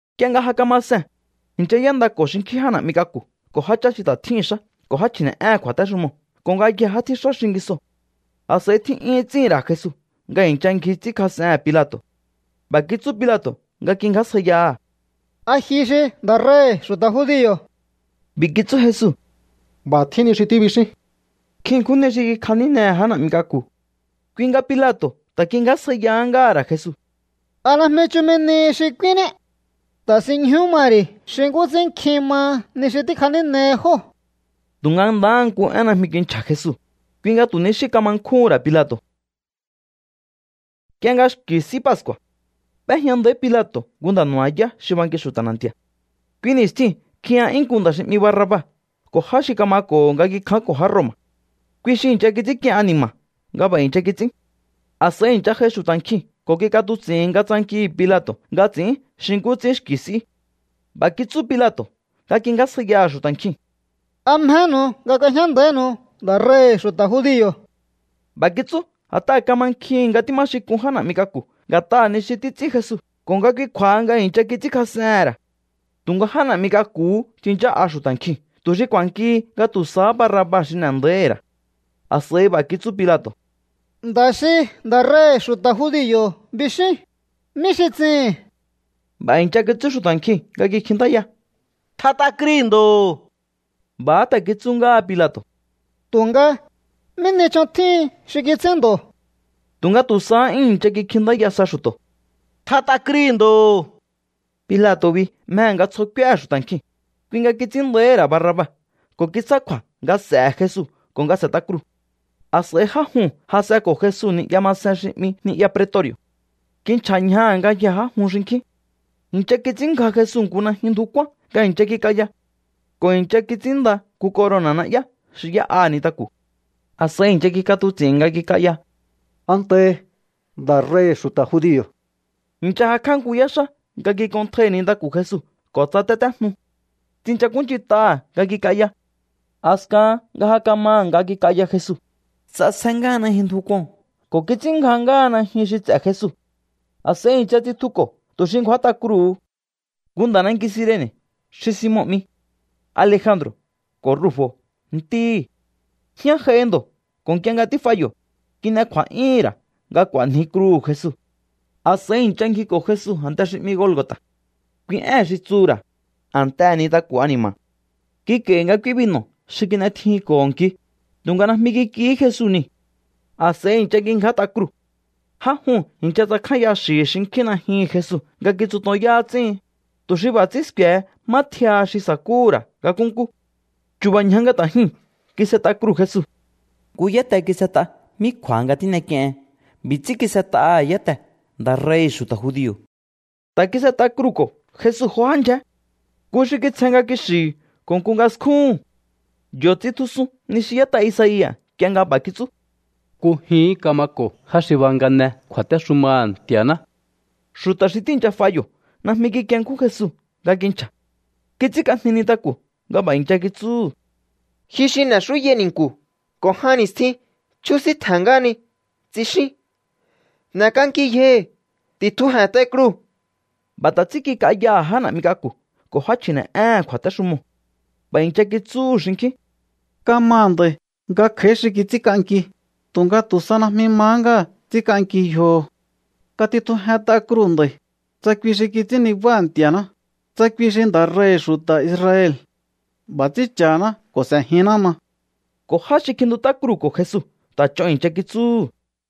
Nk'ie nga ja kama see̱n, i̱ncha y'éndako̱ xinkjín já na̱'mi k'aku̱ ko̱ jáchá xi ta̱ tjíhi̱n xá ko̱ já chji̱ne̱'éhe̱n kju̱a̱téxumoo̱ ko̱ ngayjee̱ já tjíxá xingisoo̱. A̱s'a̱i tjí'yúhún ts'íhi̱n ra̱ Jesu nga i̱ncha ngji ts'ínkjas'ehe̱n Pilato̱. B'a̱ kitsú Pilato̱ nga kingjásjaiyaha̱: —¿A ji xi nda̱ rei̱hi̱ xu̱ta̱ judio̱? B'i̱ kitsú Jesu: —B'a̱ tjín ni xi tíbixín. Nkjin ṉkjún ni xi kikjanínehe̱ já na̱'mi k'aku̱. Kui nga Pilato̱ ta̱ kingjásjaiyahá ngáha̱ ra̱ Jesu: —¿A najmi chumi nihi xi k'úínní? Ta̱sinñjú ma ri̱ xi nkú ts'ín nkjin maha ni xi tíkjanínehi jóo̱. Tu̱nga ndahá nku én najmi kinchja̱ Jesu. Kui nga tu̱ ni xí kama nkjúhu̱n ra̱ Pilato̱. Nk'ie nga xki̱ S'í Pascu̱a̱, b'éjña nda̱í Pilato̱ nku nda̱ nu̱ba̱yá xi banki xu̱ta̱ na̱nti̱a̱. Kui ni̱stjiu̱n kjiya'yún nku nda̱ xi 'mi Barraba ko̱ já xi kamako̱ho̱ nga kikjánko̱ já Roma̱. Kui xi i̱ncha kits'ínk'ien ani̱ma̱ nga b'a̱ i̱ncha kits'ín. A̱s'a̱i i̱ncha j'ai xu̱ta̱ nkjiu̱n ko̱ kik'atuts'i̱n nga tsankihi̱ Pilato̱ nga ts'i̱ín xi nkú ts'ín xki̱ s'í. B'a̱ kitsú Pilato̱ nga kingjásjaiyaha̱ xu̱ta̱ nkjiu̱n: —¿A mjenu̱u nga k'uejñá nda̱ínu̱u nda̱ rei̱hi̱ xu̱ta̱ judio̱? B'a̱ kitsú a̱t'aha̱ kamankjihi̱n nga tíma xin k'un já na̱'mi k'aku̱ nga̱t'aha̱ ni xi títs'ín Jesu ko̱ nga kui kju̱a̱ha nga i̱ncha kits'ínkjas'ehe̱n ra̱. Tu̱nga já na̱'mi k'aku̱hú tsinchá'a xu̱ta̱ nkjiu̱n tu̱ xi ku̱a̱nkihi nga tu̱ sahá Barraba xi n'e̱ nda̱íhi̱ ra̱. A̱s'a̱i b'a̱ kitsú Pilato̱: —Nda̱ xi nda̱ rei̱hi̱ xu̱ta̱ judio̱ bixíún, ¿mí xi ts'ihi̱n? B'a̱ i̱ncha kitsú xu̱ta̱ nkjiu̱n nga kikjintáya: —¡Tjat'a krui̱ ndo̱! B'a̱há ta̱ kitsú ngáha Pilato̱: —Tu̱nga, ¿mí ni ch'on tjíhin xi kits'ín ndo̱? Tu̱nga tu̱ sahá 'yún i̱ncha kikjintáya sa xu̱to̱: —¡Tjat'a krui̱ ndo̱! Pilato̱ bi mjehe̱ nga tsjo k'úéhe̱ xu̱ta̱ nkjiu̱n, kui nga kits'ín nda̱íhi̱ ra̱ Barraba ko̱ kitsjá kju̱a̱ nga s'e̱he̱ Jesu ko̱ nga s'e̱t'a kruu̱. A̱s'a̱i já juu̱n jas'enko̱ Jesu ni'ya masen xi 'mi ni'ya pretori̱o̱. Kinchja̱ ñjaha̱ ngayjee̱ já jun xinkjín. I̱ncha kits'ínngja Jesu nku najyun ndju kuan nga i̱ncha kik'aya. Ko̱ i̱ncha kits'ínnda nku corona̱ na'yá xi y'é'a nintaku̱. A̱s'a̱i i̱ncha kik'atuts'i̱n nga kik'aya: —Antahi, nda̱ rei̱hi̱ xu̱ta̱ judio̱. I̱ncha jakj'á nku yáxá nga kik'onntjai nintaku̱ Jesu ko̱ tsatétéjnu. Tsinchakúnch'int'aha̱ nga kik'aya. A̱skahan nga ja kamaha̱ nga kik'aya Jesu, ts'asje ngáha najyun ndju kuo̱n ko̱ kits'ínngja ngáha najyun xi ts'e̱ Jesu. A̱s'a̱i i̱ncha tsitjuko̱ tu̱ xi ngju̱át'a kruu̱hu. Nku nda̱ nanki Cirene̱ xi Simon 'mi, Alejandro̱ ko̱ Rufo̱ ntíhi̱. Jñá j'aihi ndo̱ ko̱ nk'ie nga tíf'a yo̱, kin'e kju̱a̱'yúhún ra̱ nga k'u̱a̱nji kruu̱hu̱ Jesu. A̱s'a̱i i̱ncha ngjiko̱ Jesu a̱nte xi 'mi Golgo̱ta̱. Kui ée̱n xi tsuhu̱ ra̱: A̱ntehe̱ Nintaku̱ Ani̱ma̱. Kik'a̱i̱hi̱ nga k'úí binu̱ xi kin'etjijinko̱ho nki, tu̱nga najmi kik'ihí Jesu niu̱. A̱s'a̱i i̱ncha kingját'a kruu̱. Já juu̱n i̱ncha tsakjánya xi̱hi̱ xinkjín najyuhu̱n Jesu nga kitsutonyá ts'íhin, tu̱ xi b'a̱ ts'ín sku̱e̱he má t'íáha xi sa̱kúhu̱ ra̱ nga nkúnkú. Chu̱ba̱ ñja nga ta̱ jyuu̱n kis'et'a kruu̱ Jesu. Nku yáte kis'et'a mí kju̱a̱ha nga tín'ek'iehen. B'i̱ ts'ín kis'et'aha̱ yátee̱: “Nda̱ rei̱hi̱ xu̱ta̱ judio̱.” Ta̱ kis'et'a kruu̱ko̱ Jesu jo já ndyjé. Nku xi kitsjen nga kixi̱hi̱ ko̱ nku nga skjúhu̱n. Yo̱ tsitjusun ni xi y'ét'a Isaia̱ nk'ie nga b'a̱ kitsú: “Nkujihín kamako̱ já xi bangane kju̱a̱téxumaha̱ Nti̱a̱ná.” Xu̱ta̱ xi tíi̱ncha f'a yo̱ najmi kikienkjún Jesu nga kinchja̱. Kits'ínk'ajni nintaku̱ nga b'a̱ i̱ncha kitsúhu̱: —Ji xi n'e̱xúyai ni̱nku̱ ko̱ jan ni̱stjin chjúsíntje̱n ngáhani, tsixín. ¡N'e̱k'anki yjohi̱! ¡Ti̱tjuje̱nt'ai kruu̱! B'a̱ ta̱ ts'ín kik'ayaha̱ já na̱'mi k'aku̱ ko̱ já chji̱ne̱'éhe̱n kju̱a̱téxumoo̱. B'a̱ i̱ncha kitsúhu̱ xinkjín: —Kamaha̱ nda̱i̱ nga kj'a̱í xi kits'ínk'anki, tu̱nga tu̱ sa najmi mahá ngáha̱ ts'ínk'anki yjoho̱. Katitjujent'a kruu̱ nd'a̱i̱, tsa kui xi kits'ín nibáha̱ Nti̱a̱ná, tsa kui xi nda̱ rei̱hi̱ xu̱ta̱ Israel. B'a̱ ts'ín cha̱haná ko̱ s'e̱jinná ma. Ko̱ já xi kjintut'á kruu̱ko̱ Jesu ta̱ ch'on i̱ncha kitsúhu̱.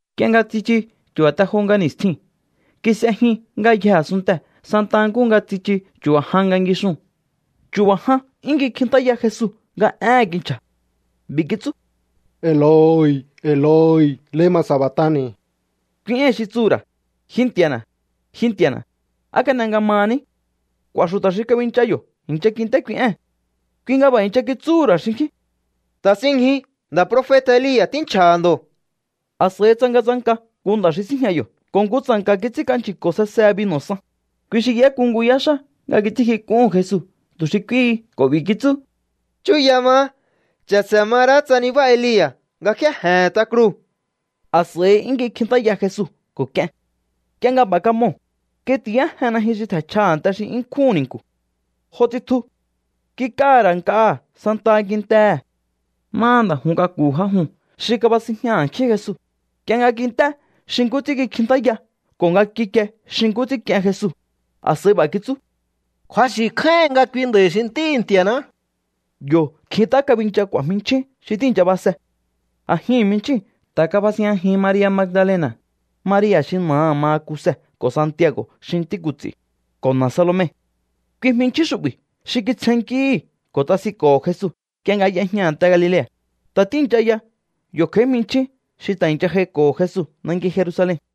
Nk'ie nga tsichu chu̱ba̱ te jo nga ni̱stjiu̱n, kis'e jyun ngayjee̱ a̱sunntee̱ santa nkúhu nga tsichu chu̱ba̱ jan nga ngixuu̱n. Chu̱ba̱ jan 'yún kikjintáya Jesu nga éhe̱n kinchja̱. B'i̱ kitsú: —Eloi, Eloi, ¿lema sabactani̱? —kui éi̱n xi tsuhu̱ ra̱: Ji Nti̱a̱na̱, ji Nti̱a̱na̱, ¿á kan'e nga mahaní? K'u̱a̱ xu̱ta̱ xi kabincha yo̱ i̱ncha kint'é kui ée̱n. Kui nga b'a̱ i̱ncha kitsúhu̱ ra̱ xinkjín: —Ta̱sinñju. Nda̱ profeta̱ Elia̱ tínchja̱ha̱ ndo̱. A̱s'a̱i tsangatsanka nku nda̱ xi síjña yo̱ ko̱ nku tsa̱nka̱ kits'ínk'anchi̱ko̱ sesehe binu̱ san. Kui xi y'éku nku yáxá nga kits'ínkjik'uhu̱n Jesu tu̱ xi k'úíhi ko̱ b'i̱ kitsú: —Chúya maá. Cha̱se̱ ma ra̱á tsa nibá Elia̱ nga kjéje̱he̱n t'a kruu̱. A̱s'a̱i 'yún kikjintáya Jesu ko̱ k'ien. Nk'ie nga b'a̱ kamoo̱, kitiyájen najyun xi tje̱nchja a̱nte xi 'yún nkjúhu̱n ni̱nku̱. Jo tsitju. Kik'aha̱ ra̱ nk'aha̱ santaha kintee̱. Máha nda̱ jun k'aku̱hu̱ já juu̱n xi kabasinjña a̱nkjín Jesu, nk'ie nga kint'é xi nkú ts'ín kikjintáya ko̱ nga kikie xi nkú ts'ín k'ien Jesu, a̱s'a̱i b'a̱ kitsú: —Kju̱axi̱ kjáíhin nga kui nda̱i̱ xi Ntíhi̱ Nti̱a̱ná. Yo̱ kjint'á kabincha k'u̱a̱ jminchjín xi tíi̱ncha base. A̱jihi̱n jminchjíu̱n ta̱ kabasinjñajin Maria̱ Magdalena̱, Maria̱ xi na̱aha̱ maha Kuse ko̱ Santiago̱ xi ntí ku̱ts'i̱, ko̱ na̱ Salome. Kui jminchjín xu'bi̱ xi kitsjennkíhi̱ ko̱ tsasinko̱ho̱ Jesu nk'ie nga y'ejña a̱nte Galilea̱. Ta̱ tíi̱ncha ya yo̱ kj'a̱í jminchjín xi ta̱ i̱ncha j'aiko̱ho̱ Jesu nanki Jerusalen.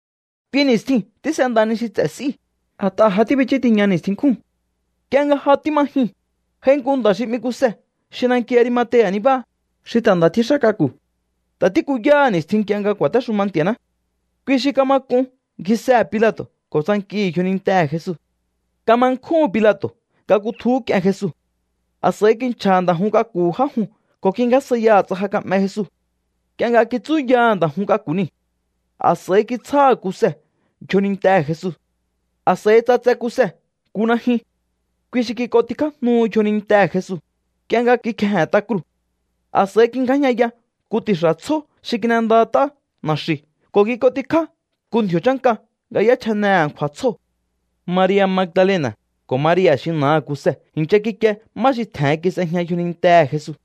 Kui ni̱stjiu̱n tís'enda ni xi ts'e̱ s'íu̱, a̱t'aha̱ ja tíbichú tiña ni̱stjin nkjúu̱n. Nk'ie nga ja tíma jyun, j'ai nku nda̱ xi 'mi Kuse xi nanki Arimatea̱ nibáha, xi ta̱ nda̱ tjíxá k'aku̱. Ta̱ tíkuyáha̱ ni̱stjin nk'ie nga ku̱a̱téxuma Nti̱a̱ná. Kui xi kama k'un ngjisehe̱ Pilato̱ ko̱ tsankihi̱ yjonintehe̱ Jesu. Kama nkjúhu̱n Pilato̱ nga kutjuhú k'ien Jesu. A̱s'a̱i kinchja̱ha̱ nda̱ jun k'aku̱hu̱ já juu̱n ko̱ kingjásjaiyaha̱ tsa ja ka'me Jesu. Nk'ie nga kitsúyaha̱ nda̱ jun k'aku̱ niu̱, a̱s'a̱i kitsjáha̱ Kuse yjonintehe̱ Jesu. A̱s'a̱i ts'atse Kuse nku najyun. Kui xi kik'ontikjájnu yjonintehe̱ Jesu, nk'ie nga kikjeje̱n t'a kruu̱. A̱s'a̱i ngjingjájñaya nku ti̱xa̱ tsjó xi kin'endat'á na̱xi̱u̱ ko̱ kik'ontikjá nku ndji̱o̱ chánka nga y'échjane a̱nkju̱a̱ tsjóo̱. Maria̱ Magdalena̱ ko̱ Maria̱ xi na̱aha̱ Kuse i̱ncha kikie má xi tje̱hen kis'ejña yjonintehe̱ Jesu.